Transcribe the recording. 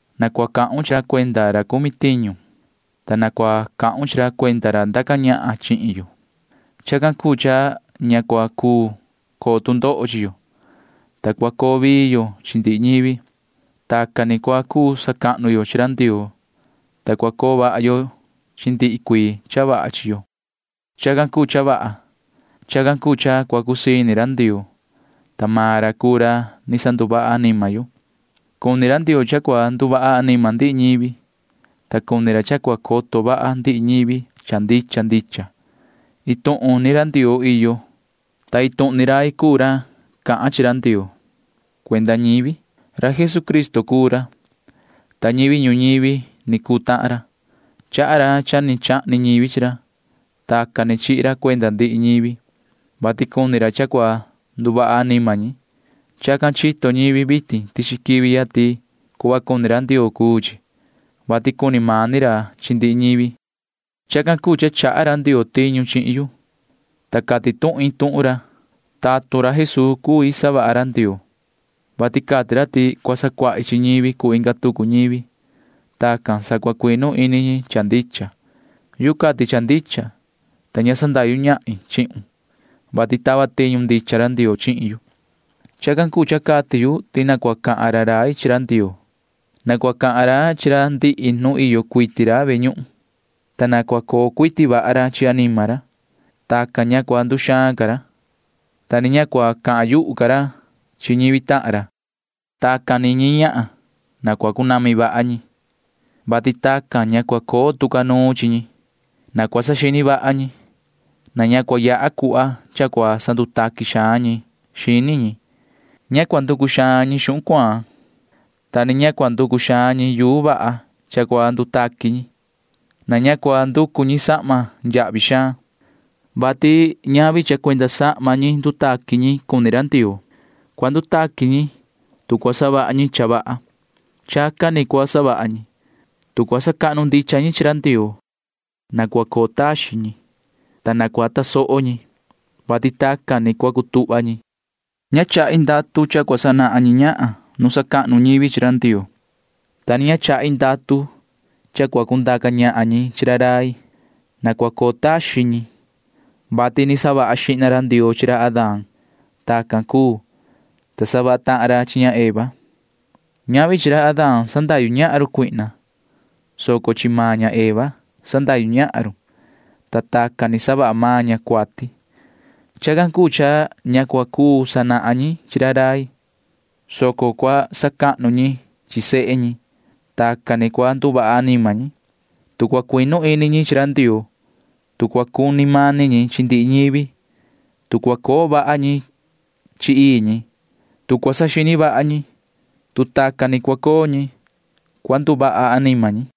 Na cua cahun chi ra cuenda ra cumi tiñu, ta na cua cahun chi ra cuenda ra ndaca ñahan chihin yo. Chacan cuu cha ña cua cuu coo tu ndoho chi yo, ta cua coo vii yo chi ndihi ñivi. Tacan ni cua cuu sacahnu yo chi ra Ndioo, ta cua coo vaha yo chi ndihi cuii cha vaha chi yo. Chacan cuu cha vaha. Chacan cuu cha cua cusii ini ra Ndioo, ta maan ra cuu ra ni sanduvaha anima yo. Cuni ra Ndioo cha cua nduvaha anima ndihi ñivi, ta cuni ra cha cua coto vaha ndihi ñivi cha ndicha ndicha. Iin tuhun ni ra Ndioo iyo, ta iin tuhun ni rai cuu ra cahan chi ra Ndioo cuenda ñivi. Ra Jesucristo cuu ra, ta ñivi ñuñivi ni cuu tahan ra. Chaha ra cha ni chahni ñivi chi ra. Tacan ni chihi ra cuenda ndihi ñivi, vati cuni ra cha cua nduvaha anima ñi. Chacan chito ñivi vitin tichi quivi ya ti cuhva cuni ra Ndioo cuu chi, vati cuni mani ra chi ndihi ñivi. Chacan cuu cha chaha ra Ndioo tiñu chihin yu, ta cati tuhin tuhun ra. Tatun ra Jesuu cui savaha ra Ndioo, vati cati ra ti cua sacuahi chi ñivi cuu inga tucu ñivi. Tacan sa cua cuinu ini ñi cha ndicha. Yuhu cati cha ndicha, ta ña sandahyu ñahin chihun, vati tava tiñu ndicha ra Ndioo chihin yu. Chacan cuu cha cati yu ti na cua cahan ra rai chi ra Ndioo. Na cua cahan ra chi ra ndihi nu iyo cuiti ra ve ñuhun, ta na cua coo cuiti vaha ra chi anima ra. Tacan ña cua nduxaan ca ra, ta ni ña cua cahan yuhu ca ra chi ñivi tahan ra. Tacan ñi ñahan na cua cunami vaha ñi, vati tacan ña cua coo tu ca nuun chi ñi. Na cua saxini vaha ñi. Na ña cua yaha cuhva cha cua sandutaqui xaan ñi xini ñi. Ña cua nducu xaan ñi xuhun cuaan, ta ni ña cua nducu xaan ñi yuu vaha cha cua ndutaqui ñi. Na ña cua nducu ñi sahma yahvi xaan, [vati ñavi cha cuenda sahma ñi ndutaqui ñi cuni ra Ndioo]. Cua ndutaqui ñi, tu cua savaha ñi cha vaha. Chacan ni cua savaha ñi, tu cua sacahnu ndicha ñi chi ra Ndioo. Na cua coo taxin ñi, ta na cua tasoho ñi, vati tacan ni cua cutuhva ñi. Ña chahi ndatu cha cua sanahan ñi ñahan nu sacahnu ñivi chi ra Ndioo, ta ni ña chahi ndatu cha cua cundaca ñahan ñi chi ra rai. Na cua coo taxin ñi, vati ni savaha xihna ra Ndioo chi ra Adán. Tacan cuu, ta savaha tahan ra chi ña Eva. Ñavi chi ra Adán sandahyu ñahan run Satanaa, soco chi maan ña Eva sandahyu ñahan run, ta tacan ni savaha maan ña cuati. Chacan cuu cha ña cua cuu sanahan ñi chi ra rai, soco cua sacuahnu ñi chi sehe ñi. Tacan ni cua nduvaha anima ñi, tu cua cuinu ini ñi chi ra Ndioo, tu cua cuni mani ñi chi ndihi ñivi, tu cua coo vaha ñi chi ii ñi, tu cua saxini vaha ñi. Tu tacan ni cua coo ñi, cua nduvaha anima ñi.